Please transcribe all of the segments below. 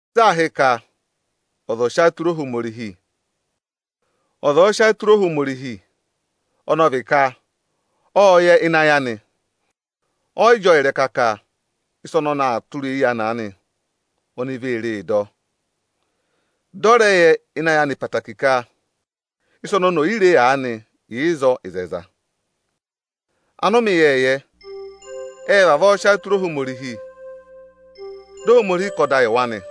Sị aa hị́ ka ọza ọ́ọ sị ayị tụra Ohomorihi? Ọza ọ̀ọ sị ayị tụra Ohomorihi, ọnị ọ vị ka ọ́ọ yẹ ịnị ayị anị, ọyị jị ọọ ịrẹka ka ịsa ọnị ọnị aa tụra eyi anị aanị, oni vee ree dọ. Dị ọ rẹ yẹ ịnị ayị anị ẹtẹẹtẹrẹ ka ịsa oni oni ò yi re aanị yà ịzọọ ịzẹyịza nị. Anụmẹ ịyẹẹyẹ ẹ́ẹ vavọọ sị ayị tụra Ohomorihi, dị Ohomorihi kà ọda yị wa nị.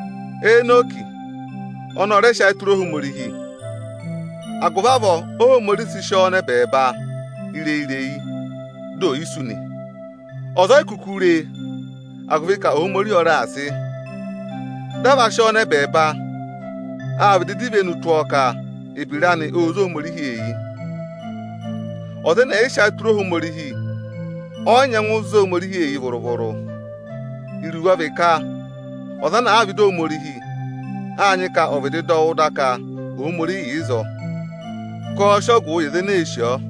Enọkị ọnị ọ rẹ sị ayị tụra Ohomorihi. Agụvị avọọ Óhomorihi sị sị ọọ nọ ẹbẹẹba ireyi-ireyi, dị ò yi sú nị. Ọza o yi kuku re e, agụvị ka Ohomorihi ọ raà sị. Dị a va sị ọọ nọ ẹbẹẹba, â vịdị dọ ivenu tụ́ ọọ ka ebira anị ô zé Ohomorihi eyi. Ọza ẹnẹ ẹ̀ yị sị ayị tụra Ohomorihi, ọ yị nyẹngụ zé Ohomorihi eyi vụrụ-vụrụ. Iruvo ọ vị ka ọza ana àa vẹ ịdị Ohomorihi, áa nyị ka ọ̀ vịdị dọ wụ́ da ka Ohomorihi yà ịzọọ, ọnịrị ka ọọ̄ sị ọgụụ yị aza ene èe sì ọọ.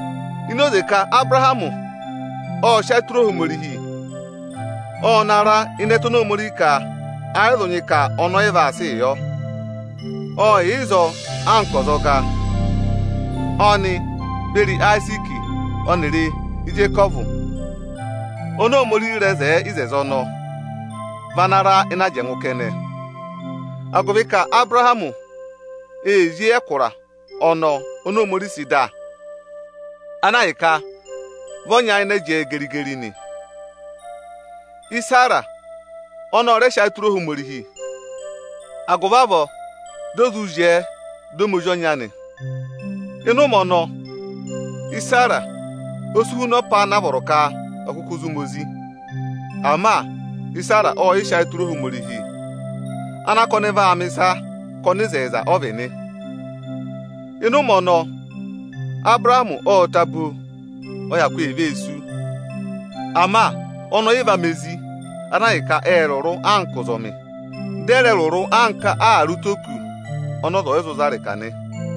Ini oze ka Abụrahamị ộ sị ayị tụra Ohomorihi, ọ na ra ịnị ẹtẹ oni Ohomorihi ka ẹ yị zụ nyị ka ọnị ọ yị vaa sịị yọ. Ộ yà ịzọọ anka ọzọga. Ọnị beri Ayiziiki ọnịrị Ijekọvụ oni Ohomorihi rẹ hị́ eku ọnọọ vị ana ra ịnị ajẹngụ kẹnẹ, agụvị ka Abụrahamị ee zí eyi ẹkụra ọnọọ oni Ohomorihi sị dà, ana ahịka vị ọ nyayịnẹ jẹẹ geri-geri nị. Isera ọnị ọ rẹ sị ayị tụra Ohomorihi, agụvị avọọ di o zụ zyẹẹ, dị ọ ma ozi ọnya nị. Ịnị ụmẹ ọnọọ, Isera osi huna ọza ana vọrọ ka ọ̀ kụkụ zụ ma ozi. Ama Isera ộ sị ayị tụra Ohomorihi ana ka ọnị vaa mẹ̀ ịsa ka ọnịzẹyịza ọ vị nị. Ịnị ụmẹ ọnọọ, Abụrahamị ộ ta bo, ọ hyakụ e vee sú. Ama ọnị ọyị va ma ezi ana ahịka ẹẹ rụrụ anka ụzọmị, dị ẹ rẹ rụrụ anka ààrẹ ụtọ ókụ̄ ọnị ọza ọ̀yị zụ za ịrịka nị.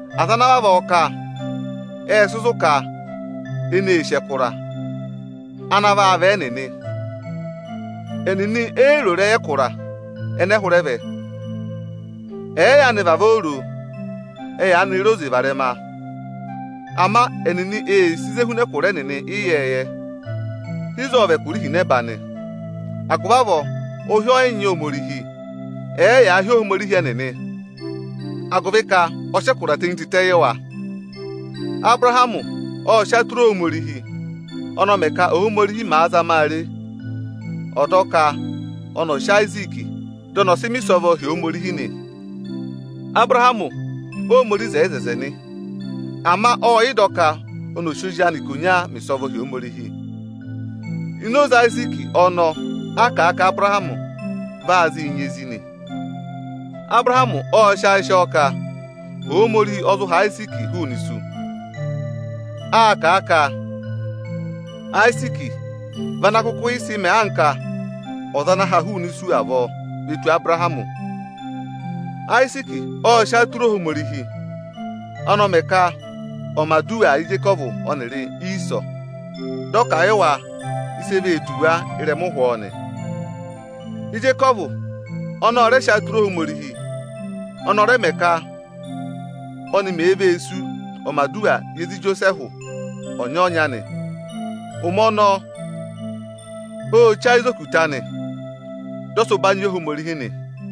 Aza ana vavọọ kà, ẹ́ẹ sị zụ̀ ka ẹnị ee sì ẹkụra ana vị ẹ́ẹnịnị. Ẹnịnị e yi ro ịrẹyị ẹkụra ẹnẹ hụrẹ vẹ. Ẹ̀ẹ yaanị vavọọ ro o, ẹ yaanị re oze varẹma. Ama ẹnịnị ee sì ịzị e huna ẹkụra ẹnịnị ịyẹẹyẹ, ịzọọ ọ vị ẹkụra ihinẹba nị. Agụvị avọọ ụhị ọ yị nyị Ohomorihi, ẹ̀ẹ yaa hị́ ọ Ohomorihi ẹnịnị, agụvị ka ọ sị ẹkụra tenyi tịtẹ yị wa. Abụrahamị ộ sị ayị tụra Ohomorihi. Ọnị ọ mẹ ka Óhomorihi mẹ̀ zama a re, ọ̀ dọ ka ọnị ọ̀ sị Ayiziiki, dị ọnị ọ̀ sị mẹ̀ ịsọvọ hi Ohomorihi nị. Abụrahamị Óhomorihi hị́ eku nị, ama ô tenyi ẹngụ ka ọnị ọ̀ sị ozi anị ikonya mẹ̀ ịsọvọ hi Ohomorihi. Ini oze Ayiziiki ọnọọ a kà a ka Abụrahamị va zịị nyị ezi nị. Abụrahamị ộ sị ayị sị ọ ka Ohomorihi ọ zụ ha Ayiziiki hụụnị isu. Àa kà a à kà a Ayiziiki vị ana sị mẹẹ anka ọza ana ha hụụnị isu avọọ ve tù Abụrahamị. Ayiziiki ộ sị ayị tụra Ohomorihi. Ọnị ọ rẹ mẹ ka ọ̀ mẹ̀ aduwa yị Ijekọvụ ọnịrị Iisọ, dị ọ kà a yị wa ịsị e vee tù wa ịrẹma ụhwọọ nị. Ijekọvụ ọnị ọ rẹ sị ayị tụra Ohomorihi. Ọnị ọ mẹ ka óni mèe vee sú, ọ̀ mẹ̀ aduwa yị ezi Ijosẹẹhụ ọnya-ọnya nị. Ụmẹ ọnọọ ô che ayị za okutẹ anị, dị ọ sị ụbanyị yị Ohomorihi nị.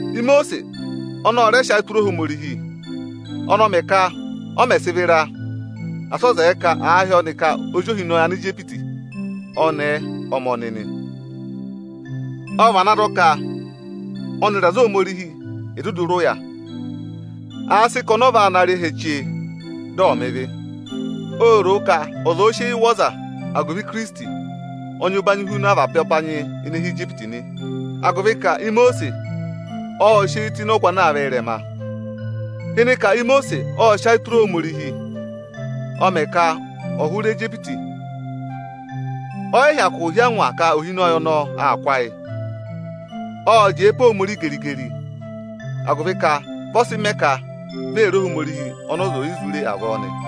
Imosiisi ọnị ọ rẹ sị ayị tụra Ohomorihi. Ọnị ọ mẹ ka ọ mẹ̀ sị vịra, asị ọ zẹẹ ka àa hị́ ọnị ka ozi ohinọyị Anijipiti ọnẹẹ ọ ma ọnị nị. Ọ vana dọ ka ọnịrị aza Ohomorihi è duduu rị ụya, àa sị ka ọnị ọ va naa rị ẹhẹ chee, dị ọ̀ mẹ ịvị. Ô ro ka ọza òo sị eyi wụ̀ ọza agụvị Ikirisiti, ọ́ọ nyị ụbanyị huna avaba ụbanyị ene hi Ijipiti, agụvị ka Imosiisi ọ́ọ sị eyi tụ́ ịnị ọgụ ana aa vẹ ị́rẹma. Ịnị ka Imosiisi ọ sị sị ayị tụra Ohomorihi, ọ mẹ ka ọ̀ hụrẹ Ijipiti. Ọ yị hyakụ hí angwa ka ohinọyị ọnọọ aa kụ́ ayị. Ộ jẹẹ pe Ohomorihi geri-geri, agụvị ka vị ọ sị mẹẹ ka vi ee re Ohomorihi ọnị ọza ò yi zụ re avọọ nị.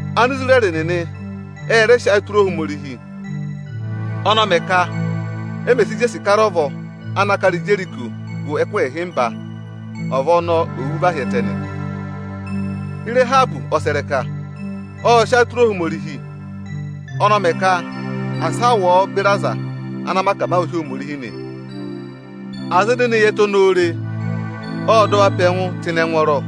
Anisirẹrị nịnị ẹ rẹ sị ayị tụra Ohomorihi. Ọnị ọ mẹ ka e mè si jesi kara ọvọ ana kara Ijeriko gụ ẹkụhị ịhịmba, ọvọ ọnọọ ò wú và hi ẹtẹ nị. Ịrahabị ọsẹrẹka ộ sị ayị tụra Ohomorihi. Ọnị ọ mẹ ka asị a wụ ọọ beri aza ana mẹ akamawụ hi Ohomorihi nị. Aza ene ne yi ẹtẹ ọnọọ re, ọ́ọ dọ wa pe ẹngụ tụ́ ịnị ẹngwọọrọ.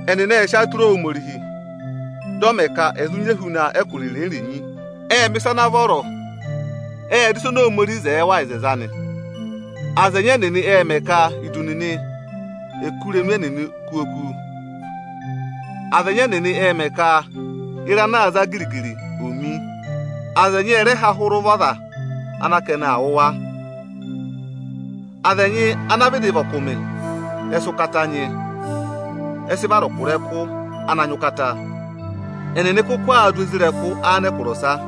Ẹnịnị ệ sị ayị tụra Ohomorihi, dị ọ mẹ ka ẹ̀ zụ nyị ehuna ẹkụra irenyi-irenyi nị, ệ mẹ̀ ịsa ana vọrọ, ệ dọ ịsa oni Ohomorihi zẹẹ wa ịzẹzẹ anị. Aza ẹnyị ẹnịnị ệ mẹ ka idu nịnị è kú irenu ẹnịnị kú oku. Aza ẹnyị ẹnịnị ệ mẹ ka ịra ana aa za giri-giri, ò mi. Aza ẹnyị ẹ rẹ há hụrẹ ụvọ aza ana ka ẹnị aa wụ̀ wa. Aza ẹnyị ana vịdị vị ọkụmị, ẹ sị ụkata nyị. Ẹ sị vara ọkụrẹkụ ana nyị ụkata. Ẹnịnị kụkụ aa dụ isoja nịnị anẹkụra ọsa.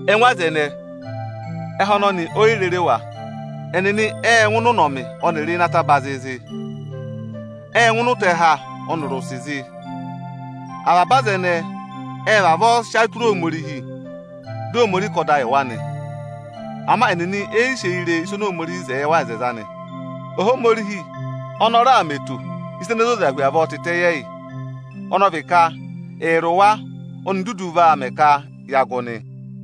Ẹngụ aza ẹnẹẹ, ẹhẹ ọnọnị o yi rere wa. Ẹnịnị ệ ngụ ịnị ẹtẹ ọpaapara ọnịrị ịnị ataba zịịzị, ệ ngụ ịnị ụtẹha ọnịrị ụsị zị. Avaba aza ẹnẹẹ ệ vavọọ sị ayị tụra Ohomorihi, dị Ohomorihi kà ọda yị wa nị; ama ẹnịnị e yi sị eyi re ịsa oni Ohomorihi zẹẹ wa ịzẹzẹ anị. Ohomorihi ọnị ọ raà mẹ eto ịsa ene zoza hu avọọ tịtẹ yị ẹyị, ọnị ọ vị ka ẹyịrị wa oni dudu vaa mẹ ka ya gụ nị.